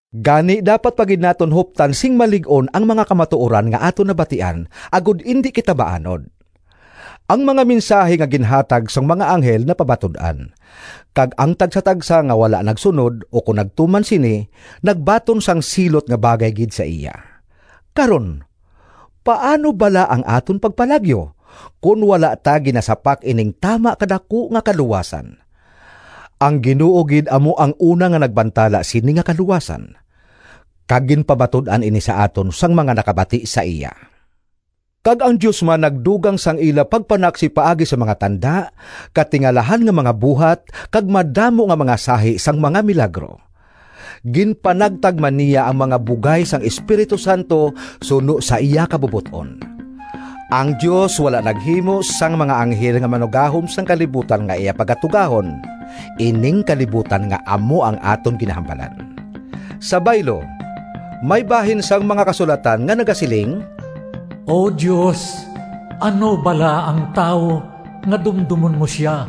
Gani dapat pa gid naton huptan sing malig-on ang mga kamatuoran nga aton nabatian, agod indi kita maanod. Ang mga mensahi nga ginhatag sang mga anghel napamatud-an, kag ang tagsatagsa nga wala nagsunod ukon nagtuman sini, nagbaton sang silot nga bagay gid sa iya. Karon, paano bala ang aton pagpalagyo, kon wala ta ginasapak ining tama ka daku nga kaluwasan? Ang Ginoo gid amo ang una nga nagbantala sini nga kaluwasan, kag ginpamatud-an ini sa aton sang mga nakabati sa iya. Kag ang Dios man nagdugang sang ila pagpanaksi paagi sa mga tanda, katingalahan nga mga buhat kag madamo nga mga sahi sang mga milagro. Ginpanagtag man niya ang mga bugay sang Espiritu Santo suno sa iya kabubot-on. Ang Dios wala naghimo sang mga anghel nga manuggahom sang kalibutan nga iya pagatugahon—ining kalibutan nga amo ang aton ginahambalan. Sa baylo, may bahin sang mga Kasulatan nga nagasiling: “O Dios, ano bala ang tawo, Nga dumdomon mo sia?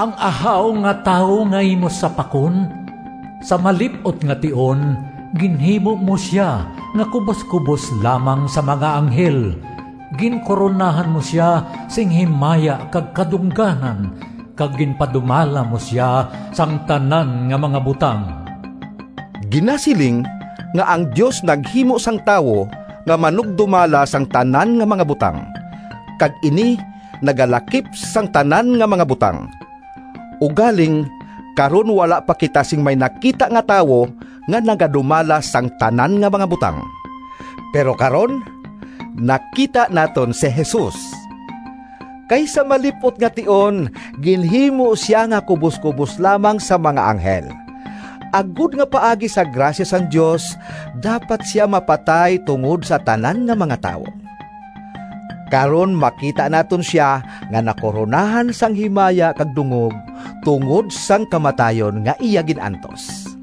Ang ahaw nga tawo Nga imo sapakon? Sa malip-ot nga tion Ginhimo mo sia Nga kuboskubos lamang sa mga anghel, Ginkoronahan mo sia Sing himaya kag kadungganan, Kag ginpadumala mo sia Sang tanan nga mga butang.” Ginasiling nga ang Dios naghimo sang tawo nga “manugdumala sang tanan nga mga butang,” kag ini nagalakip sang tanan nga mga butang. Ugaling karon wala pa kita sing may nakita nga tawo nga nagadumala sang tanan nga mga butang. Pero karon nakita naton si Jesus! Kay sa malip-ot nga tion ginhimo sia nga kuboskubos lamang sa mga anghel, agod nga paagi sa grasya sang Dios dapat sia mapatay tungod sa tanan nga mga tawo. Karon makita naton sia nga nakoronahan sang himaya kag dungog tungod sang kamatayon nga iya gin-antos.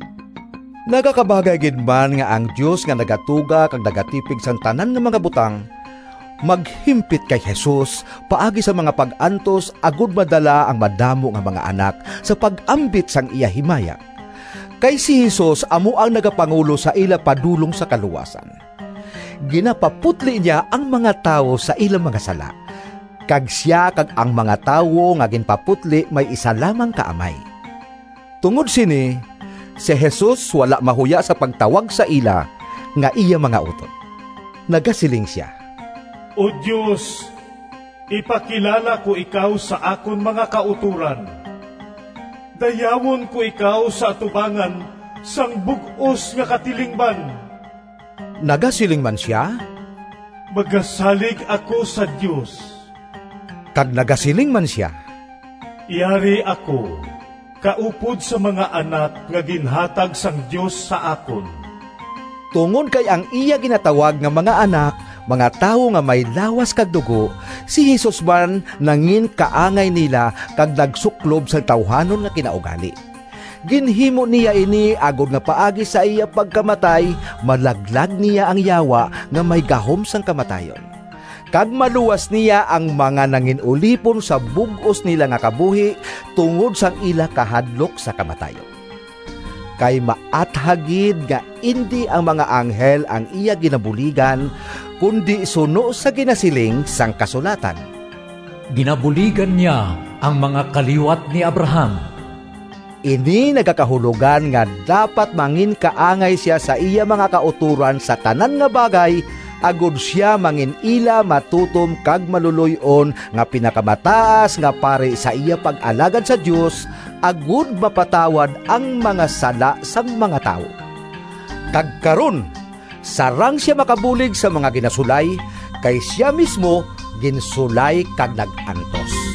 Nagakabagay gid man nga ang Dios, nga nagatuga kag nagatipig sang tanan nga mga butang, maghimpit kay Jesus paagi sa mga pag-antos, agod madala ang madamo nga mga anak sa pag-ambit sang iya himaya. Kay si Jesus amo ang nagapangulo sa ila padulong sa kaluwasan. Ginapaputli niya ang mga tawo sa ila mga sala, kag sia kag ang mga tawo nga ginpaputli may isa lamang ka Amay. Tungod sini si Jesus wala mahuya sa pagtawag sa ila nga iya mga utod. Nagasiling sia: “O Dios, ipakilala ko ikaw Sa akon mga kautoran, Dayawon ko ikaw Sa atubangan Sang bug-os nga katilingban.” Nagasiling man sia, “Magasalig ako sa Dios.” Kag nagasiling man sia, “Yari ako kaupod sa mga anak nga ginhatag sang Dios sa akon.” Tungod kay ang iya ginatawag nga mga anak, mga tawo nga may lawas kag dugo, si Jesus man nanginkaangay nila kag nagsuklob sang tawuhanon nga kinaugali. Ginhimo niya ini agod nga paagi sa iya pagkamatay malaglag niya ang Yawa, nga may gahom sang kamatayon, kag maluwas niya ang mga nangin-ulipon sa bug-os nila nga kabuhi tungod sang ila kahadlok sa kamatayon. Kay maathag gid nga indi ang mga anghel ang iya ginabuligan, kundi suno sa ginasiling sang kasulatan, “Ginabuligan niya ang mga kaliwat ni Abraham.” Ini nagakahulogan nga dapat manginkaangay sia sa iya mga kautoran sa tanan nga bagay, agod sia mangin-ila matutom kag maluloy-on nga pinakamataas nga pari sa iya pag-alagad sa Dios, agod mapatawad ang mga sala sang mga tawo. Kag karon sarang sia makabulig sa mga ginasulay, kay sia mismo ginsulay kag nag-antos.